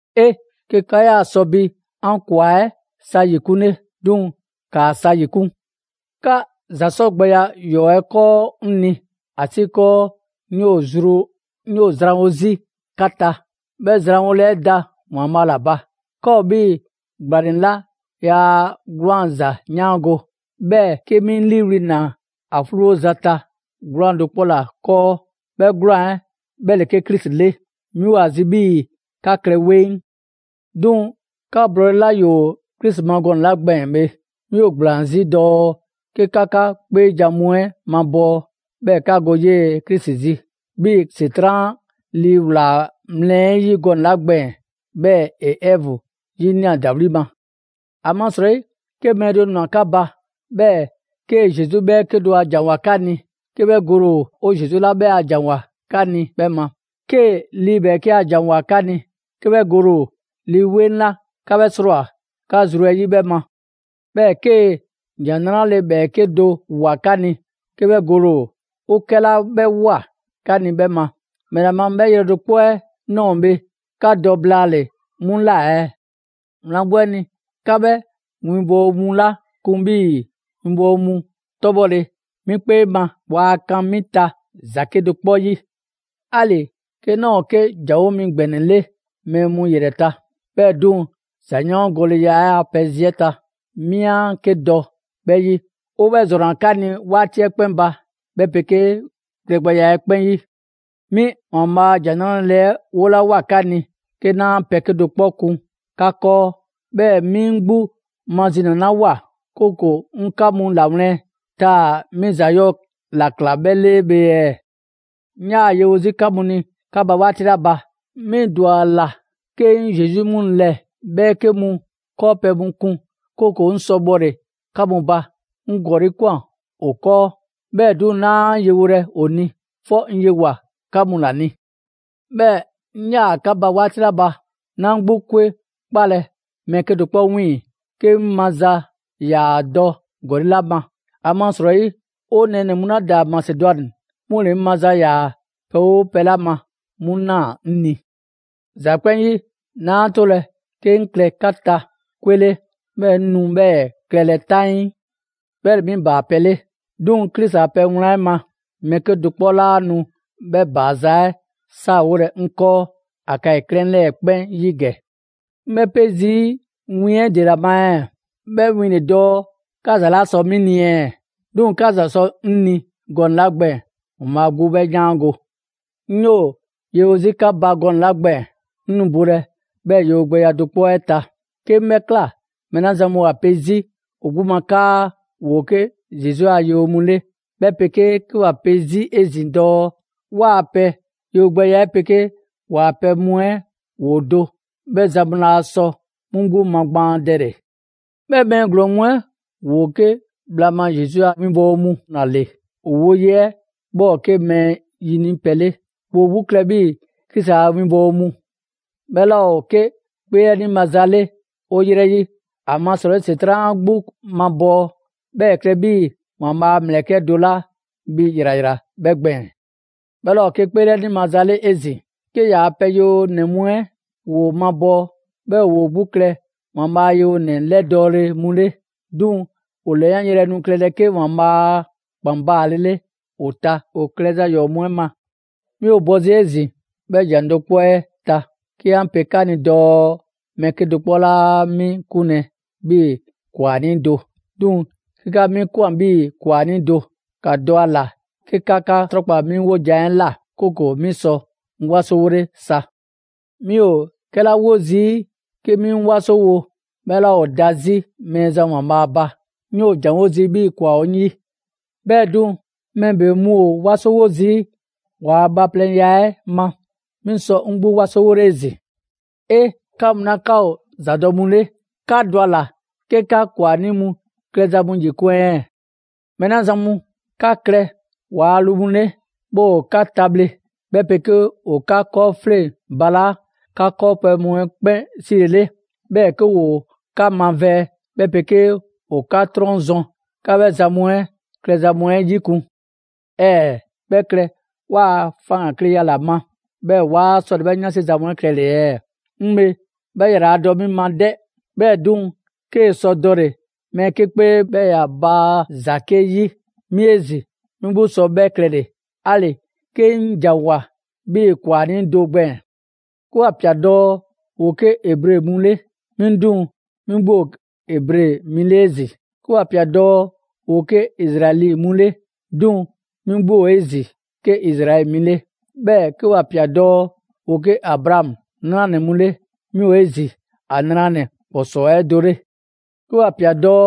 'E! 'Ke 'ka 'yaa sɔ bi 'an ‑kwa 'ɛ sa 'yikunle! 'Duŋ‑, ‑kaa sa ‑yikun'! 'Ka ‑za 'sɔgbɛya ‑yɔɔ' 'ɛ 'kɔɔ 'ŋ ni, ‑asiikɔɔ 'ŋ 'yoo‑ zrwanwo 'zi 'ka ta, 'bhɛ zranwole 'ɛ da ‑Waanbhaa' ‑la ba. 'Ka ‑o 'bhii‑ ‑gblanɛ 'la yaa 'gwlaanza‑ 'yaango‑, 'bhɛɛ‑ 'ke 'mi 'ŋ 'liiwli‑ ꞊naa ‑a 'fluwoza ta 'gwlaan‑ do 'kpɔ ‑la 'kɔɔ, 'bhɛ 'gwlaan‑ 'ɛ 'bhɛ ‑le 'ke Krisi 'le. 'Mi ‑o ‑a zi 'bhii‑ 'ka klɛ 'weŋ. 'Duŋ‑ 'ka blɔɔle 'la ‑yoo Krisi ma gɔnɛ‑ 'la gbɛɛn‑ bhe, 'mi ‑o ‑gblaan 'zi dɔɔ 'ke 'ka 'ka 'kpeejan‑ mu 'ɛ mabɔɔ, 'bhɛɛ‑ 'ka go 'yee‑ Krisi zi; 'bhii‑ ‑Setran' lii ꞊wlaa mlɛ 'ɛ 'yi gɔnɛ‑ 'la gbɛɛn‑, 'bhɛɛ‑ ‑e Ɛvu 'yinia꞊ ‑dawli' ma. ‑Amasrɔyi 'ke mɛɛ do ꞊nwa 'ka ba, 'bhɛɛ‑ 'kee‑ Zesu 'bhɛɛke do ‑a ‑janwoa 'ka ni 'ke 'bhɛ gole ‑o 'o Zesu 'la 'bhɛ a ‑janwoa 'ka ni 'bhɛ ma, ‑ 'kee‑ lii 'bhɛɛke a ‑janwoa 'ka ni 'ke 'bhɛ gole ‑o Lii 'Weŋ 'la 'ka 'bhɛ 'srɔɔwoa꞊ 'ka zru 'ɛ 'yi 'bhɛ ma; 'bhɛɛ‑ 'kee‑ ‑Jan 'Nrale‑ ‑bhɛɛke' do ꞊woa 'ka ni 'ke 'bhɛ gole ‑o 'o 'kɛla 'bhɛ ꞊woa 'ka ni 'bhɛ ma. ‑Mɛla ma 'bhɛɛ‑ 'bhɛ yrɛ do 'kpɔ 'ɛ ꞊nɔɔ bhe 'ka dɔ blaale‑ 'mu ꞊la ɛɛ? Wlan 'gbu 'ɛ ni, 'ka 'bhɛ winbɔwo mu 'la kun 'bhii‑ 'winbɔwo mu 'tɔbhɔle, 'mi 'kpee ma waa kan 'mi ta ‑za 'kedo‑ 'kpɔ 'yi. 'Ali‑ 'ke 'naa ‑o 'ke ‑janwo' mi ‑gbɛnɛ 'le mɛɛ mu ‑yrɛ ta; 'bhɛɛ‑ 'duŋ‑ ‑zayaangoleya a pɛ zi 'ɛ ta, 'mi 'a 'ke dɔ 'bhɛ 'yi. 'O 'bhɛ ‑zrɔnna 'ka ni 'waati 'ɛ 'kpɛn ba, 'bhɛ 'pegee klɛgbɛya 'ɛ 'kpɛn 'yi. 'Mi ‑Waanbhaa' a ‑Jan 'Nrale‑ 'ɛ 'wolawoa 'ka ni 'ke 'naa pɛ 'kedo‑ 'kpɔ kun 'ka 'kɔɔ, 'bhɛɛ‑ 'mi 'ŋ 'gbu mazinalawoa, 'kooko‑ 'ŋ 'ka mu ‑lawlɛn', taa‑ 'mi ‑za 'yɔɔ‑ ‑la ꞊kla 'bhɛ 'le bhe ɛɛ? 'Ŋ 'yaa‑ yewo 'zi 'ka mu ni 'ka ba 'waati 'la ba, 'mi ‑dwa ‑a ‑la 'ke 'ŋ Zesu 'yi mu ‑lɛ ‑bhɛɛke' mu 'kɔɔpɛ‑ mu kun, 'kooko‑ 'ŋ sɔ bhɔle‑ 'ka mu ba. 'Ŋ ‑gɔli' ꞊kwan ‑o 'kɔɔ, 'bhɛɛ‑ 'duŋ‑ 'naa yewolɛ ‑o ni, 'fɔ 'ŋ yewoa‑ 'ka mu ‑la ni. 'Bhɛɛ‑ 'ŋ 'yaa‑ 'ka ba 'waati 'la ba, 'naa 'ŋ 'gbu 'kwe 'kpalɛ‑ mɛɛ 'kedo‑ 'kpɔ 'wiiŋ‑ 'ke 'ŋ maza ‑yaa dɔ ‑gɔli' ma. ‑Amasrɔyi, 'o nɛɛnɛ‑ mu 'la ‑daa Masedwani 'mu ‑le 'ŋ maza ‑yaa pɛ 'oo pɛ 'la ma 'mu ꞊naa 'ŋ ni. ‑Za 'kpɛn 'yi, 'naa 'tolɛ‑ 'ke 'ŋ klɛ 'ka ta 'kwe 'le, 'bhɛɛ‑ 'ŋ nu 'bhɛɛ‑ klɛlɛ 'taŋii. 'Bhɛ ‑le 'mi ‑baapɛ' 'le. 'Duŋ‑ Krisi a pɛ wlan 'ɛ ma, mɛɛ 'kedo‑ 'kpɔ 'laa nu 'bhɛ ‑baaza' 'ɛ 'saawole 'ŋ 'kɔɔ Akayi 'klɛɛn 'lɛɛ‑ 'kpɛn 'yi ‑gɛ. 'Ŋ 'bhɛ pe zii' win 'ɛ ‑dela ma ɛɛ? 'Bhɛ win le dɔɔ 'ka ‑za 'laa sɔ 'mi ni ɛɛ? 'Duŋ‑ 'ka ‑za sɔ 'ŋ ni gɔnɛ‑ 'la gbɛɛn‑ ‑Waanbhaa' 'gbu 'bhɛ 'yaango‑. 'Ŋ 'yoo‑ yewo 'zi 'ka ba gɔnɛ‑ 'la gbɛɛn‑, 'ŋ nu bolɛ 'bhɛɛ‑ yewogbɛya do 'kpɔ 'ɛ ta. 'Ke 'ŋ 'bhɛ ꞊kla, mɛɛ 'la zan mu ‑o 'a 'pe zii' ‑o 'gbu ma 'kaa ‑woo 'ke Zesu a 'winbɔwo mu 'le, 'bhɛ 'pegee 'ke ‑wa pe 'zi 'ezin‑ dɔɔ 'waa‑ pɛ yewogbɛya 'ɛ 'pegee ‑waa' pɛ mu 'ɛ ‑woo do, 'bhɛ zan mu laa sɔ 'mu 'gbu magbaandɛle. 'Bhɛ mɛɛ ‑glɔɔn mu 'ɛ ‑woo 'ke bhla ma Zesu a 'winbɔwo mu ‑la ‑le, ‑o woye 'ɛ 'bhɛ ‑o 'ke mɛɛ ‑yini' pɛ 'le. ‑Woo 'gbu klɛ 'bhii‑ Krisi a winbɔwo mu. 'Bhɛ 'laa ‑o 'ke 'kpeelɛni maza 'le 'o 'yrɛ 'yi, ‑amasrɔyi ‑Setran' 'a 'gbu mabɔɔ, 'bhɛɛ‑ ‑e klɛ 'bhii‑ ‑Waanbhaa' a ‑mlɛkɛ' do 'la bhi ‑yrayra 'bhɛ gbɛɛn‑. 'Bhɛ 'laa ‑o 'ke 'kpeelɛni maza 'le 'ezin‑, 'ke ‑yaa' pɛ yewonɛ mu 'ɛ ‑woo mabɔɔ, 'bhɛɛ‑ ‑woo 'gbu klɛ ‑Waanbhaa' a yewonɛ 'lɛdɔɔle mu 'le. 'Duŋ‑ ‑o ‑lɛyanyrɛ nu klɛlɛ 'ke ‑Waanbhaa' a ‑kpan baalele ‑o ta ‑o klɛza ‑yɔɔ' mu 'ɛ ma. 'Mi ‑o bɔ 'zi 'ezin‑ 'bhɛ ‑jan do 'kpɔ 'ɛ ta 'ke 'an pe 'ka ni dɔɔ mɛɛ 'kedo‑ 'kpɔ 'laa 'mi 'kunlɛ‑ 'bhii‑ ‑kwanii' do. 'Duŋ‑ 'ke 'ka 'mi ꞊kwan 'bhii‑ ‑kwanii' do, ‑ka dɔ ‑a ‑la 'ke 'ka 'ka 'trɔnkpa 'mi 'wojan‑ 'ɛ ꞊la, 'kooko‑ 'mi sɔ 'ŋ 'wasowole sa. 'Mi ‑o 'kɛla 'wo zii' 'ke 'mi 'ŋ 'wasowo 'bhɛ 'laa ‑o da 'zi Mɛɛzan ‑Waanbhaa' ba; 'ŋ 'yoo‑ ‑janwo' zii' 'bhii‑ ‑kwa ‑o 'ŋ 'yi. 'Bhɛɛ‑ 'duŋ‑, mɛɛ ‑bebe mu ‑o 'wasowo zii' ‑waa' bhaaplɛŋya 'ɛ ma, 'mi sɔ 'ŋ 'gbu 'wasowole 'ezin‑. 'E! Ka mu 'la 'ka ‑o ‑zadɔ' mu 'le, 'ka dɔ ‑a ‑la 'ke 'ka ‑kwanii' mu klɛza mu ‑yikun' ɛɛ! Mɛɛ 'la zan mu 'ka klɛ ‑waa' lu mu 'le, 'bhɛɛ‑ ‑o 'ka tabhle; 'bhɛ 'pegee ‑o 'ka 'kɔɔfleŋ balaa' 'ka 'kɔɔpɛ‑ mu 'ɛ 'kpɛn 'silele; 'bhɛɛ‑ 'ke ‑woo 'ka mavɛɛ; 'bhɛ 'pegee ‑o 'ka 'trɔn zɔn, 'ka 'bhɛ zan mu 'ɛ klɛza mu 'ɛ 'yikun‑. ‑Ɛɛ! 'Bhɛ klɛ 'waa‑ faŋgankleya ‑la ma, 'bhɛɛ‑ 'waa 'sɔlɛ‑ 'bhɛ 'yansi za mu 'ɛ klɛle‑ ɛɛ? 'Ŋ bhe 'bhɛ ‑yraladɔ 'mi ma 'dɛ. 'Bhɛɛ‑ 'duŋ‑, 'kee‑ sɔ dɔle‑ mɛɛ 'ke 'kpee 'bhɛɛ‑ ‑ya baa ‑za 'ke 'yi; 'mi 'ezin‑ 'mi 'gbu sɔ 'bhɛ klɛle‑; 'ali‑ 'ke 'ŋ ‑janwoa 'bhii‑ ‑kwanii' do gbɛɛn‑. 'Ke ‑wa ꞊pia dɔɔ ‑woo 'ke Ebre mu 'le, 'mi 'duŋ‑ 'mi 'gbu ‑o Ebre mi 'le 'ezin‑. 'Ke ‑wa ꞊pia dɔɔ ‑woo 'ke Izraɛli mu 'le, 'duŋ‑ 'mi 'gbu ‑o 'ezin‑ 'ke Izraɛli mi 'le. 'Bhɛɛ‑ 'ke ‑wa ꞊pia dɔɔ ‑woo 'ke Abraamu 'nranɛ‑ mu 'le, 'mi ‑o 'ezin‑ ‑a ‑nranɛ ‑kpɔsɔɔ 'ɛ do 'le. 'Ke ‑wa ꞊pia dɔɔ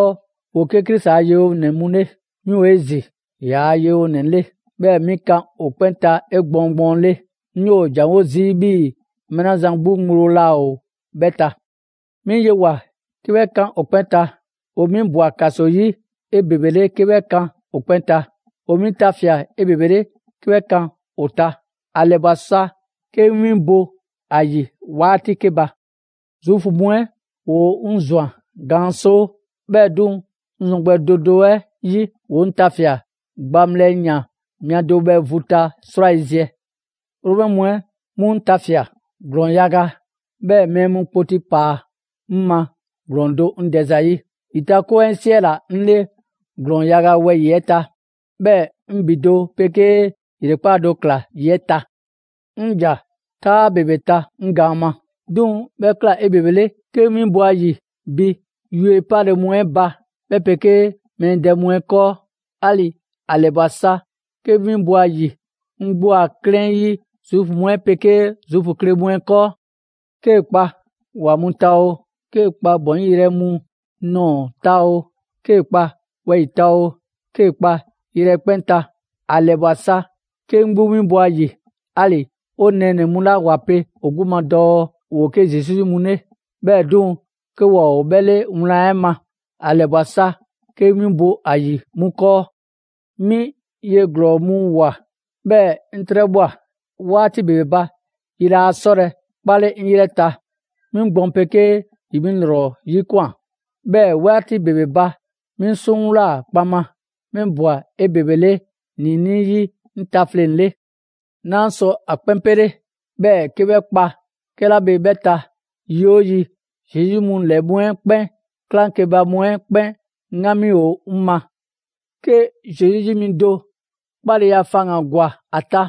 ‑woo 'ke Krisi a yewonɛ mu 'le, 'mi ‑o 'ezin‑ ‑yaa' yewonɛ 'le, 'bhɛɛ‑ 'mi kan ‑o 'kpɛn ta 'egbɔɔn gbɔɔnle'. 'Ŋ 'yoo‑ ‑janwo' zii' 'bhii‑ mɛɛ 'la zan 'gbu ŋgblo laa ‑o 'bhɛ ta. 'Mi yewoa꞊ 'ke 'bhɛ kan ‑o 'kpɛn ta, ‑o 'mi ꞊bwa ‑kaso 'yi 'ebebele 'ke 'bhɛ kan ‑o ta; ‑o 'mi tafia꞊ 'ebebele 'ke 'bhɛ kan ‑o ta. ‑A ‑lɛbwa sa 'ke 'ŋ 'winbo‑ ‑a ‑yi 'waati 'ke ba. Zuufu mu 'ɛ ‑woo 'ŋ ꞊zwan gaan 'soo. 'Bhɛɛ‑ 'duŋ‑, 'ŋ zɔn gbɛ do do 'ɛ 'yi, ‑woo 'ŋ tafia꞊ gbaŋbhlɛ yan mia do bhɛ vu ta 'srwayiziɛ. Romɛ mu 'ɛ 'mu 'ŋ tafia꞊ ‑glɔɔn yaga, 'bhɛɛ‑ mɛɛ mu kpoti mu ꞊paa 'ŋ ma ‑glɔɔn do 'ŋ dɛ zayi'. ‑Yitakoŋ 'ɛ 'siɛla‑ 'ŋ 'le ‑glɔɔn yaga wɛyi‑ 'ɛ ta, 'bhɛɛ‑ 'ŋ ‑bi do 'pegee ‑yrekpaa' do ꞊kla ‑yi 'ɛ ta. 'Ŋ ‑ja 'taa ‑bebe ta 'ŋ gaan ma; 'duŋ‑ 'bhɛ ꞊kla 'ebebele 'ke 'ŋ 'winbo‑ ‑a ‑yi bi yue 'pale‑ mu 'ɛ ba, 'bhɛ 'pegee mɛɛ dɛ mu 'ɛ 'kɔɔ. 'Ali‑ ‑a ‑lɛbwa sa 'ke 'ŋ 'winbo‑ ‑a ‑yi 'ŋ 'gbu a 'klɛɛn 'yi Zuufu mu 'ɛ 'pegee Zuufu kle mu 'ɛ 'kɔɔ. 'Kee‑ kpa ‑wa mu ta oo, 'kee‑ kpa ‑bɔnyi' yrɛ mu nɔɔ‑ ta oo, 'kee‑ kpa wɛyi‑ ta oo, 'kee‑ kpa yrɛ 'ɛ 'kpɛn ta, ‑a ‑lɛbwa sa 'ke 'ŋ 'gbu winbo‑ ‑a ‑yi. 'Ali‑ 'o nɛɛnɛ‑ mu 'la ‑wa pe ‑o 'gbu ma dɔɔ ‑woo 'ke Zesu 'yi mu 'le, 'bhɛɛ‑ 'duŋ‑ 'ke waa ‑o 'bhɛ 'le wlan 'ɛ ma, ‑a ‑lɛbwa sa 'ke 'ŋ 'winbo‑ ‑a ‑yi 'mu 'kɔɔ. 'Mi ye ‑glɔɔ mu ꞊woa, 'bhɛɛ‑ 'ŋ 'trɛbhwa꞊. 'Waati ‑bebe ba, yi laa 'sɔlɛ‑ 'kpale 'ŋ 'yrɛ ta. 'Mi gbɔn 'pegee ‑yi 'mi ‑lrɔ 'yikwan꞊. 'Bhɛɛ‑ 'waati ‑bebe ba, 'mi 'suŋwlaa‑ kpaŋma. 'Mi ꞊bwa 'ebebele ‑niinii' 'yi 'ŋ tafleŋ‑ 'le. 'Naa sɔ ‑a 'kpɛn 'pele. 'Bhɛɛ‑ 'ke 'bhɛ kpa 'kɛla bhe 'bhɛ ta, yi 'oo yi, Zesu 'yi mu ‑lɛ mu 'ɛ 'kpɛn 'klaŋkeba mu 'ɛ 'kpɛn 'ŋgami ‑o 'ŋ ma. 'Ke Zesu 'yi mi do 'kpaleya faŋgan‑ ‑gwa ‑a ta,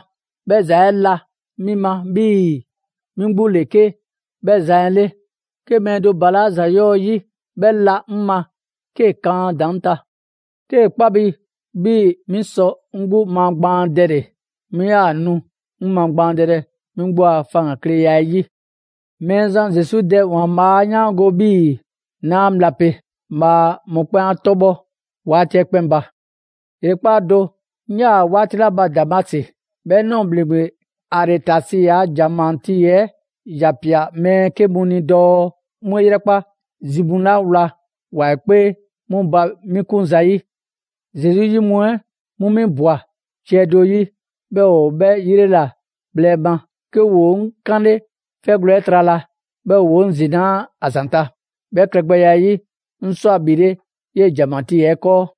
'bhɛ ‑za 'ɛ la 'mi ma 'bhii‑ 'mi 'gbu ‑le 'ke 'bhɛ zan 'ɛ 'le. 'Ke mɛɛ do ‑balaa' ‑za 'yɔɔ‑ 'yi, 'bhɛ 'la 'ŋ ma 'kee‑ kan a ‑daŋ' ta. 'Kee‑ 'kpa bi 'bhii‑ 'mi sɔ 'ŋ 'gbu magbaandɛle, 'mi 'yaa‑ nu 'ŋ magbaandɛlɛ 'mi 'gbu a faŋgankleya 'ɛ 'yi. Mɛɛzan Zesu Dɛ ‑Waanbhaa' 'a 'yaango‑ 'bhii‑ 'naa bhla pe. Bhaa mɔkpɛn' 'a 'tɔbhɔ 'waati 'ɛ 'kpɛn ba! ‑Yrekpaa' do, 'ŋ 'yaa‑ 'waati 'la ba Damasi, 'bhɛ ꞊nɔɔ ‑bhleŋgbe Aretasi a ‑janmatii 'ɛ ‑ya ꞊pia mɛɛ 'ke mu ni dɔɔ 'mu 'e 'yrɛkpa zi mu 'la wla ‑wa 'ɛ 'kpee 'mu ba 'mi kun zayi'. Zesu 'yi mu 'ɛ 'mu 'mi ꞊bwa ciɛ do 'yi, 'bhɛɛ‑ ‑o bhlɛ ‑yrela bhɛ ma; 'ke ‑woo 'ŋ 'kanle 'fɛgwlɛ‑ 'ɛ trala, 'bhɛɛ‑ ‑woo 'ŋ zinaa' ‑a zanta'. 'Bhɛ klɛgbɛya 'ɛ 'yi, 'ŋ ꞊swa ‑bhile' 'yee‑ ‑janmatii 'ɛ 'kɔɔ.